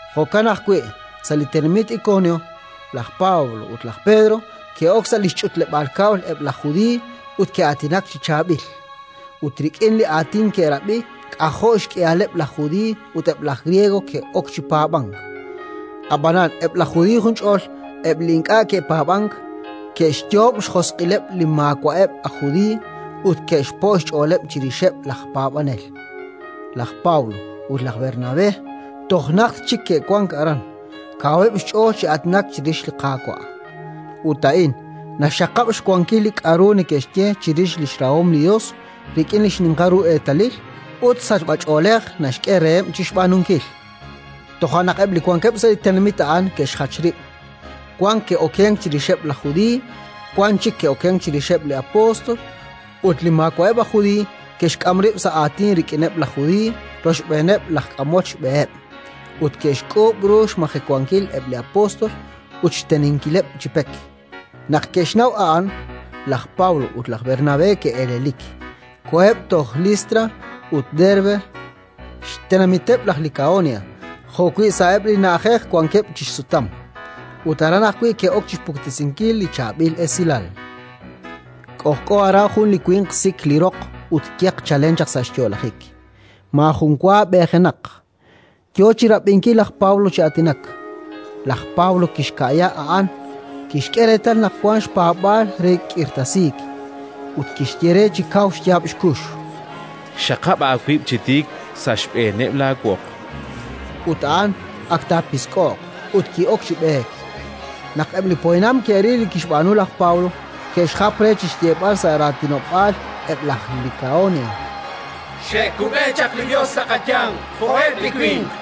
Jo'kan ajwi', sa' li tenamit Ikonio, laj Pablo ut laj Pedro ke'ok sa' li xch'utleb'aal kab'l eb' laj Judiiy ut ke'aatinak chi chaab'il; ut rik'in li aatin ke'rab'i k'ajo' xk'ihaleb' laj Judiiy ut eb' laj Griego ke'ok chi paab'ank. Ab'anan eb' laj Judiiy junch'ol, eb' li ink'a' ke'paab'ank, ke'xyoob' xjosq'ileb' li maawa'eb' aj Judiiy ut ke'xpo' xch'ooleb' chirixeb' laj paab'anel. Laj Pablo ut laj Bernabé toj najt chik ke'wank aran, kaweb' xch'ool chi aatinak chirix li Qaawa'; ut A'in naxxaqab' xwankil li k'aru neke'xye chirix li xrahom li Yos rik'in li xninqal ru eetalil ut sachb'ach'oolej naxk'e reheb' chi xb'aanunkil. Toja' naq eb' li wankeb' sa' li tenamit a'an ke'xjach rib': wan ke'okenk chirixeb' laj Judiiy, wankeb' chik ke'okenk chirixeb' li apóstol. Ut eb' li maawa'eb' aj Judiiy ke'xk'am rib' sa' aatin rik'ineb' laj Judiiy rochb'eeneb' laj k'amol xb'eheb', ut ke'xk'uub' ru xmajewankil eb' li apóstol ut xteninkileb' chi pek. Naq ke'xnaw a'an, laj Pablo ut laj Bernabé ke'elelik, koheb' toj Listra ut Derbe, xtenamiteb' laj Likaonia, jo'wi' sa'eb' li na'ajej wankeb' chi xsutam. Ut aran ajwi' ke'ok chi xpuktesinkil li Chaab'il Esilal. K'ojk'o aran jun li winq sik li roq ut yeq chalen chaq sa' xyo'lajik, maajun wa b'eejenaq, yo chi rab'inkil laj Pablo chi aatinak. Laj Pablo kixka'ya a'an, kixk'e reetal naq wank xpaab'aal re k'irtasiik, ut kixye re chi kaw xyaab' xkux: —Xaqab' aawib' chi tiik sa' xb'eeneb' laawoq. Ut a'an ak taapisk'oq, ut ki'ok chi b'eek. Naq eb' li poyanam ke'ril li kixb'aanu laj Pablo, ke'xjap re chi xyeeb'al sa' raatinob'aal eb' laj Likaonia: —Xe'kub'e chaq li Yos sa' qayanq jo'eb' li winq.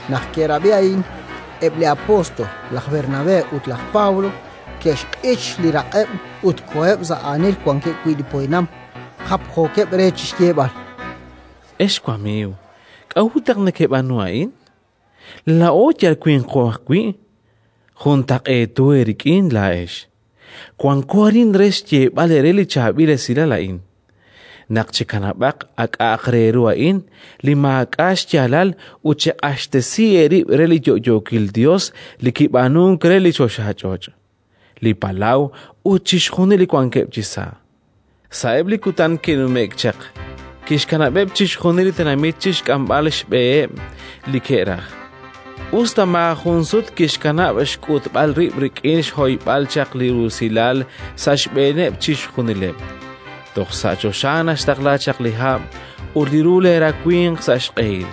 Naq ke'rab'i a'in, eb' li apóstol laj Bernabé ut laj Pablo ke'xq'ich li raq'eb' ut koheb' sa' aanil wankeb' wi' li poyanam, japjookeb' re chi xyeeb'al: —Ex qamiiw, k'a'ut naq nekeb'aanu a'in? Laa'o yal winqo ajwi', juntaq'eeto eerik'in laa'ex. Wanko arin chi xyeeb'al eere li chaab'il esilal a'in: naq chekanab'aq a k'a'aq re ru a'in li maak'a' xyaalal ut cheq'axtesi eerib' re li yo'yookil Yos li kib'aanunk re li choxach'och', li palaw ut chixjunil li wankeb' chisa'. Sa'eb' li kutan ke'numje'k chaq kixkanab'eb' chixjunil li tenamit chi xk'amb'al xb'eheb' li ke'raj, us ta maajun sut kixkanab' xk'utb'al rib' rik'in xhoyb'al chaq li rusilal sa' xb'eeneb' chixjunileb'; toj sa' choxa naxtaqla chaq li hab' ut li ru leerawimq sa' xq'ehil,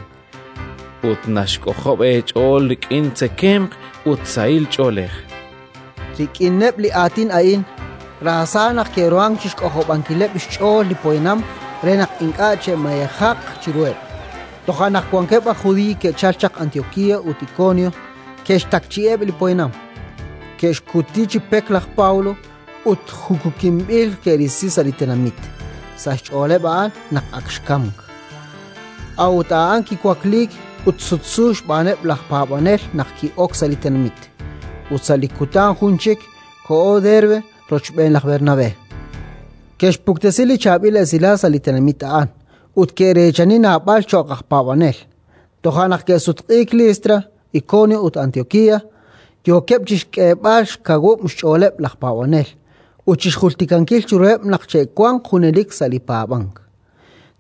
ut naxk'ojob' eech'ool rik'in tzekemq ut sahil ch'oolej. Rik'ineb' li aatin a'in, raasa naq ke'ruhank chi xk'ojob'ankileb' xch'ool li poyanam re naq ink'a' che'mayejaq chiruheb'. Toja' naq wankeb' aj Judiiy ke'chalk chaq Antiokía ut Ikonio, ke'xtakchi'i eb' li poyanam. Ke'xkuti chi pek laj Pablo, ut chi jukukinb'il ke'risi sa' li tenamit, sa' xch'ooleb' a'an naq ak xkamk. A'ut a'an kiwakliik, ut sutsu xb'aaneb' laj paab'anel naq ki'ok sa' li tenamit. Ut sa' li kutan jun chik koho Derbe rochb'een laj Bernabé. Ke'xpuktesi li Chaab'il Esilal sa' li tenamit a'an ut ke'reechani naab'al cho'q aj paab'anel; toja' naq ke'sutq'iik Listra, Ikonio ut Antiokía, yookeb' chi xk'eeb'al xkawub' xch'ooleb' laj paab'anel ut chi xjultikankil chiruheb' naq che'wanq junelik sa' li paab'ank: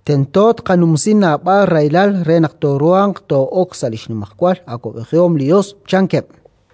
“Tento tqanumsi naab'al rahilal re naq tooruuq too'ok sa' li xnimajwal awab'ejihom li Yos”, chankeb'.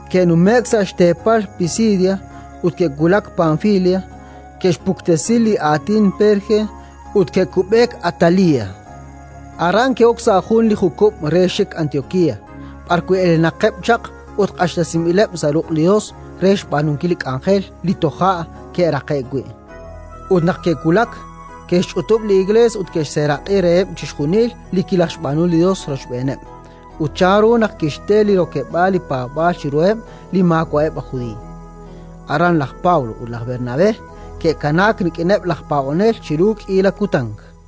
Ke'nume'k sa' xteepal Pisidia ut ke'wulak Panfilia; ke'xpuktesi li Aatin Perge, ut ke'kub'eek Atalía. Aran ke'ok sa' jun li jukub' re xik Antiokía, b'ar wi' elenaqeb' chaq ut q'axtesinb'ileb' sa' ruq' li Yos re xb'aanunkil li k'anjel li toja' ke'raqe'k wi'. Ut naq ke'wulak, ke'xch'utub' li Iklees ut ke'xseeraq'i reheb' chixjunil li kilajxb'aanu li Yos rochb'eeneb' ut chanru naq kixte li rokeb'aal li paab'aal chiruheb' li maawa'eb' aj Judiiy. Aran laj Pablo ut laj Bernabé ke'kanaak rik'ineb' laj paab'anel chiru k'iila kutan.